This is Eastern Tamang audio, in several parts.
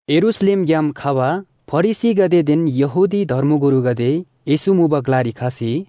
यरूशलेमग्‍याम खबा फरिसीगदेदेन यहूदी धर्मगुरुगदे येशू मुबा ग्‍लारी खसी,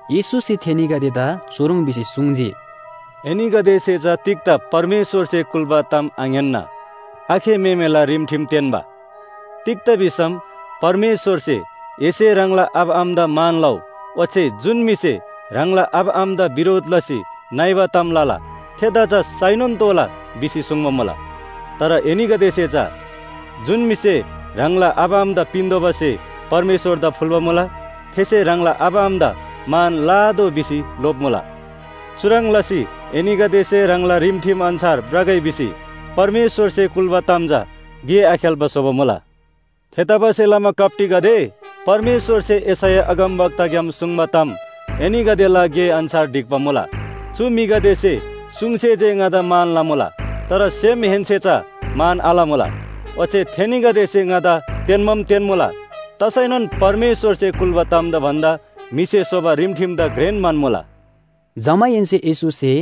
येशूसे थेनीगदेदा चुह्रङ् भिसी सुङ्जी, “एनीगदेसे चा तिग्‍दा परमेश्‍वरसे कुल्‍बा ताम आङ्‌यान्‍ना आखे म्‍हेमेला रिमठिम तेन्‍बा? तिग्‍दा भिसम परमेश्‍वरसे ‘एसे ह्राङला आबा आमादा मान लउ,’ ओच्‍छे ‘जुन म्‍हिसे ह्राङला आबा आमादा बिरोध लसी नइबा ताम लला थेदा चा साइनोन तोःला’ भिसी सुङ्बा मुला। तर एनीगदेसे चा ‘जुन म्‍हिसे ह्राङला आबा आमादा पिन्‍तोःबा स्‍हे परमेश्‍वरदा फुल्‍बा मुला, थेसे ह्राङला आबा आमादा मान लआतोः’ भिसी लोप्‍मुला। चुह्रङ् लसी एनीगदेसे ह्राङला रिमठिम अन्‍छार भ्रगै भिसी परमेश्‍वरसे कुल्‍बा ताम चा गे आखेल्‍बा स्‍होबा मुला। थेतबासेलमा कप्‍टीगदे, परमेश्‍वरसे यशैया अगमवक्ताग्‍याम सुङ्बा ताम एनीगदेला गे अन्‍छार ढिक्‍बा मुला। ‘चु म्‍हिगदेसे सुङसे जे ङादा मान लमुला, तर सेमहेन्‍से चा मान आलमुला। ओच्‍छे थेनीगदेसे ङादा तेन्‍बाम तेन्‍मुला, तसैनोन परमेश्‍वरसे कुल्‍बा तामदा भन्‍दा म्‍हिसे स्‍होबा रिमठिमदा घ्रेन म्‍हन्‍मुला।’” जमाहेन्‍से येशूसे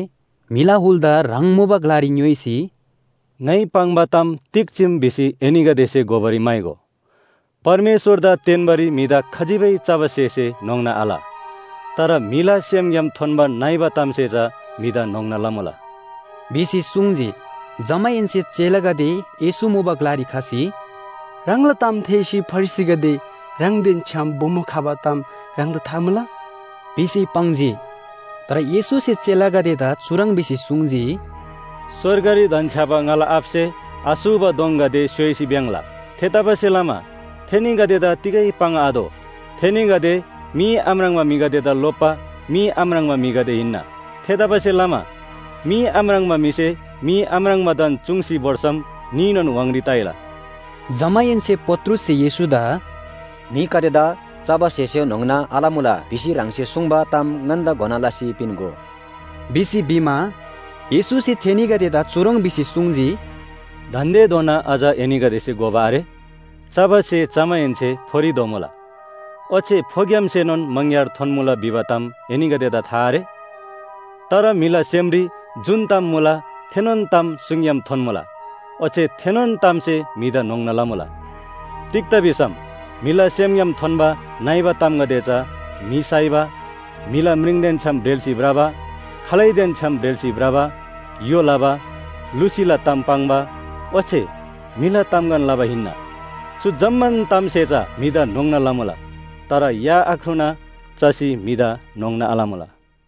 म्‍हिला हुलदा ह्राङ मुबा ग्‍लारी ङ्‌योइसी, “ङाइ पाङ्बा ताम तिग चीम भिसी एनीगदेसे घोबारी म्‍हाइगो। परमेश्‍वरदा तेन्‍बारी म्‍हिदा खजिबै चबा स्‍हेसे न्‍होङ्ना आल। तर म्‍हिला सेमग्‍याम थोन्‍बा नइबा तामसे चा म्‍हिदा न्‍होङ्ना लमुला” भिसी सुङ्जी। जमाहेन्‍से चेलागदे येशू मुबा ग्‍लारी खसी “ह्राङला ताम थेःसी फरिसीगदे ह्राङदेन छ्‌याम बोमो खबा ताम ह्राङदा था मुला?” भिसी पाङ्जी। तर येशूसे चेलागदेदा चुह्रङ् भिसी सुङ्जी, “स्‍वर्गरी धन्‍छ्‌याबा ङाला आबासे आसूबा दोङगदे स्‍योइसी भ्‍याङ्‍ला। थेतबासेलमा थेनीगदेदा तिगै पाङ्आतोः। थेनीगदे मी आम्राङ्बा म्‍हिगदेदा लोप्‍बा मी आम्राङ्बा म्‍हिगदे हिन्‍ना। थेतबासेलमा मी आम्राङ्बा म्‍हिसे मी आम्राङ्बादान चुङ्सी भोर्सम न्‍हीनोन व्‍हाङरी ताइला।” जमाहेन्‍से पत्रुससे येशूदा “म्‍हिगदेदा चबा स्‍हेसे न्‍होङ्ना आलमुला भिसी ह्राङसे सुङ्बा ताम ङन्‍दा घोना लसी पिन्‍गो” भिसी भिमा, येशूसे थेनीगदेदा चुह्रङ् भिसी सुङ्जी, “दान्‍देधोना अझ एनीगदेसे घोबा आरे? चबा स्‍हे चमाहेन्‍से फोरी धोमुला। ओच्‍छे फोग्‍यामसेनोन मङग्‍यार थोन्‍मुला भिबा ताम एनीगदेदा था आरे? तर म्‍हिला सेमरी जुन ताम मुला थेनोन ताम सुङग्‍याम थोन्‍मुला, ओच्‍छे थेनोन तामसे म्‍हिदा न्‍होङ्ना लमुला। तिग्‍दा भिसम म्‍हिला सेमग्‍याम थोन्‍बा नइबा तामगदे चा म्‍हि साइबा, म्‍हिला म्रिङदेन छ्‌याम ब्रेल्‍सी भ्रबा, खालैदेन छ्‌याम ब्रेल्‍सी भ्रबा, य्‍हो लबा, लुसीला ताम पाङ्बा ओच्‍छे म्‍हिला तामगन लबा हिन्‍ना। चु जम्‍मान तामसे चा म्‍हिदा न्‍होङ्ना लमुला। तर या आख्रुना चसी म्‍हिदा न्‍होङ्ना आलमुला।”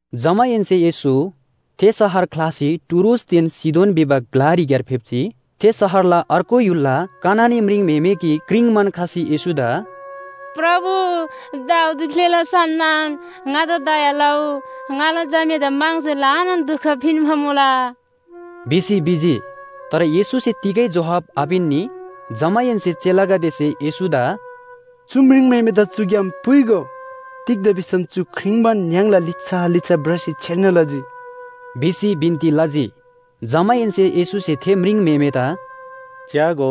जमाहेन्‍से येशू थे शहर ख्‍लासी टुरोसदेन सीदोन भिबा ग्‍लारीक्‍यार फेप्‍जी। थे शहरला अर्गु य्‍हुलला कनानी म्रिङम्‍हेमे गिक क्रिङ्बान खसी येशूदा “प्रभु, दाऊद ग्‍लेला सन्‍तान, ङादा दया लउ। ङाला झामेदा म्‍हङसे ल्‍हानान दुख पिन्‍बा मुला” भिसी भिजी। तर येशूसे तिगै जोहाब आपिन्‍नी। जमाहेन्‍से चेलागदेसे येशूदा “चु म्रिङम्‍हेमेदा चुग्‍याम पुइगो। तिग्‍दा भिसम चु क्रिङ्बान य्‍हाङला लिच्‍छा लिच्‍छा भ्रसी छेर्ना लजी” भिसी बिन्‍ती लजी। जमाहेन्‍से येशूसे थे म्रिङम्‍हेमेदा “च्‍यागो,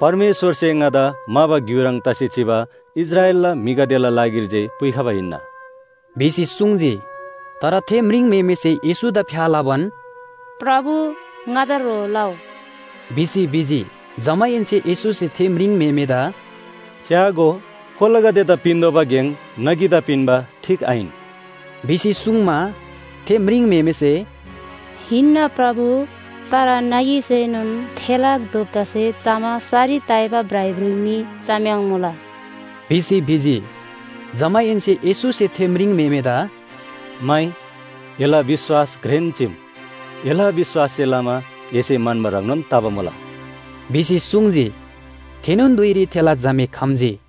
परमेश्‍वरसे ङादा म्‍हाबा ग्‍यु ह्रङ् तसी चिबा इस्राएलला म्‍हिगदेला लागिरी जे पुइखबा हिन्‍ना” भिसी सुङ्जी। तर थे म्रिङम्‍हेमेसे येशूदा फ्‍या लबान, “प्रभु, ङादा ह्रो लउ” भिसी भिजी। जमाहेन्‍से येशूसे थे म्रिङम्‍हेमेदा “च्‍यागो, कोलागदेदा पिन्‍तोःबा गेङ नगीदा पिन्‍बा ठीक आहिन” भिसी सुङ्मा, थे म्रिङम्‍हेमेसे “हिन्‍ना प्रभु, तर नगीसेनोन थेला दोप्‍तासे चमा सरी ताइबा भ्राइभ्रुइ मी चम्‍याङ्मुला” भिसी भिजी। जमाहेन्‍से येशूसे थे म्रिङम्‍हेमेदा “माइ, एला विश्‍वास घ्रेन चीम। एला विश्‍वाससे लमा एसे म्‍हन्‍बा ह्रङ्नोन तबा मुला” भिसी सुङ्जी। थेनोन धुइरी थेला झामे खम्‍जी।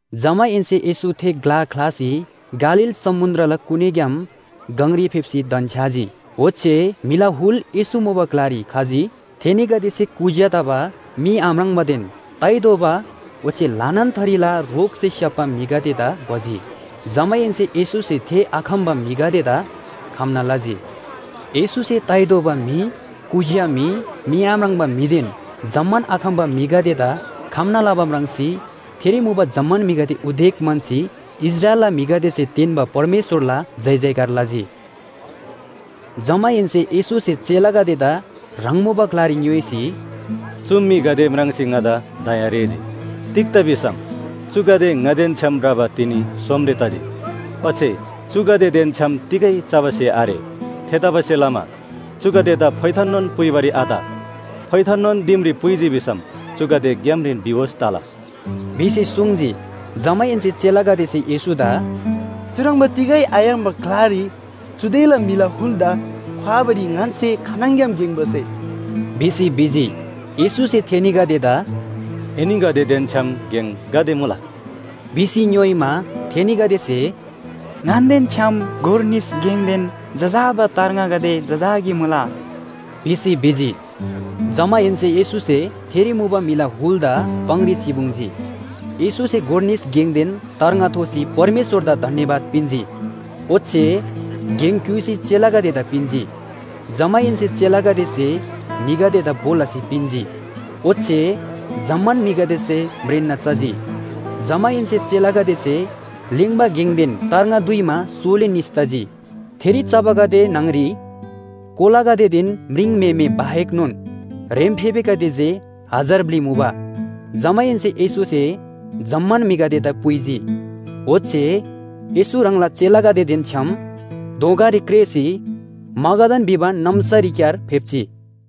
जमाहेन्‍से येशू थे ग्‍ला ख्‍लासी गालील समुन्‍द्रला कुनीग्‍याम गङरी फेप्‍सी धन्‍छ्‌याजी। ओच्‍छे म्‍हिला हुल येशू मुबा ग्‍लारी खजी। थेनीगदेसे कुज्‍या तबा, मी आम्राङ्बादेन ताइ दोबा ओच्‍छे ल्‍हानान थरीला रोगसे स्‍याप्‍बा म्‍हिगदेदा भजी। जमाहेन्‍से येशूसे थे आखम्‍बा म्‍हिगदेदा खम्‍ना लजी। येशूसे ताइ दोबा म्‍हि, कुज्‍या म्‍हि, मी आम्राङ्बा म्‍हिदेन जम्‍मान आखम्‍बा म्‍हिगदेदा खम्‍ना लबा म्राङ्सी थेरी मुबा जम्‍मान म्‍हिगदे उदेक म्‍हन्‍सी इस्राएलला म्‍हिगदेसे तेन्‍बा परमेश्‍वरला जयजयकार लजी। जमाहेन्‍से येशूसे चेलागदेदा ह्राङ मुबा ग्‍लारी ङ्‌योइसी, “चु म्‍हिगदे म्राङ्सी ङादा दया रेःजी। तिग्‍दा भिसम चुगदे ङादेन छ्‌याम भ्रबा तिनी सोमरे तजी। ओच्‍छे चुगदेदेन छ्‌याम तिगै चबा स्‍हे आरे। थेतबासेलमा चुगदेदा फोइथाननोन पुइबारी आत। फोइथाननोन दिमरी पुइजी भिसम चुगदे ग्‍यामरीन बिहोस तला” भिसी सुङ्जी। जमाहेन्‍से चेलागदेसे येशूदा “चुह्रङ्बा तिगै आयाङ्बा ग्‍लारी चुदेला म्‍हिला हुलदा ख्‍वाबारी ङन्‍से खानङग्‍याम गेङ भसे?” भिसी भिजी। येशूसे थेनीगदेदा “एनीगदेदेन छ्‌याम गेङ गाते मुला?” भिसी ङ्‌योइमा, थेनीगदेसे “ङन्‍देन छ्‌याम गोर निस गेङदेन जजाबा तार्ङागदे जजाकी मुला” भिसी भिजी। जमाहेन्‍से येशूसे थेरी मुबा म्‍हिला हुलदा पाङरी चिपुङ्जी। येशूसे गोर निस गेङदेन तार्ङा थोसी परमेश्‍वरदा धन्‍यवाद पिन्‍जी। ओच्‍छे गेङ क्‍युइसी चेलागदेदा पिन्‍जी। जमाहेन्‍से चेलागदेसे म्‍हिगदेदा भो लसी पिन्‍जी। ओच्‍छे जम्‍मान म्‍हिगदेसे म्रेन्‍ना चजी। जमाहेन्‍से चेलागदेसे लेङ्बा गेङदेन तार्ङा दुइमा सोली निस तजी। थेरी चबागदे न्‍हङ‍री कोलागदेदेन म्रिङम्‍हेमे बाहेकनोन ह्रेम्‍फेबेगदे जे हजार ब्‍लि मुबा। जमाहेन्‍से येशूसे जम्‍मान म्‍हिगदेदा पुइजी। ओच्‍छे येशू ह्राङला चेलागदेदेन छ्‌याम दोँगारी क्रेःसी मगादान भिबा नाम्‍सारीक्‍यार फेप्‍जी।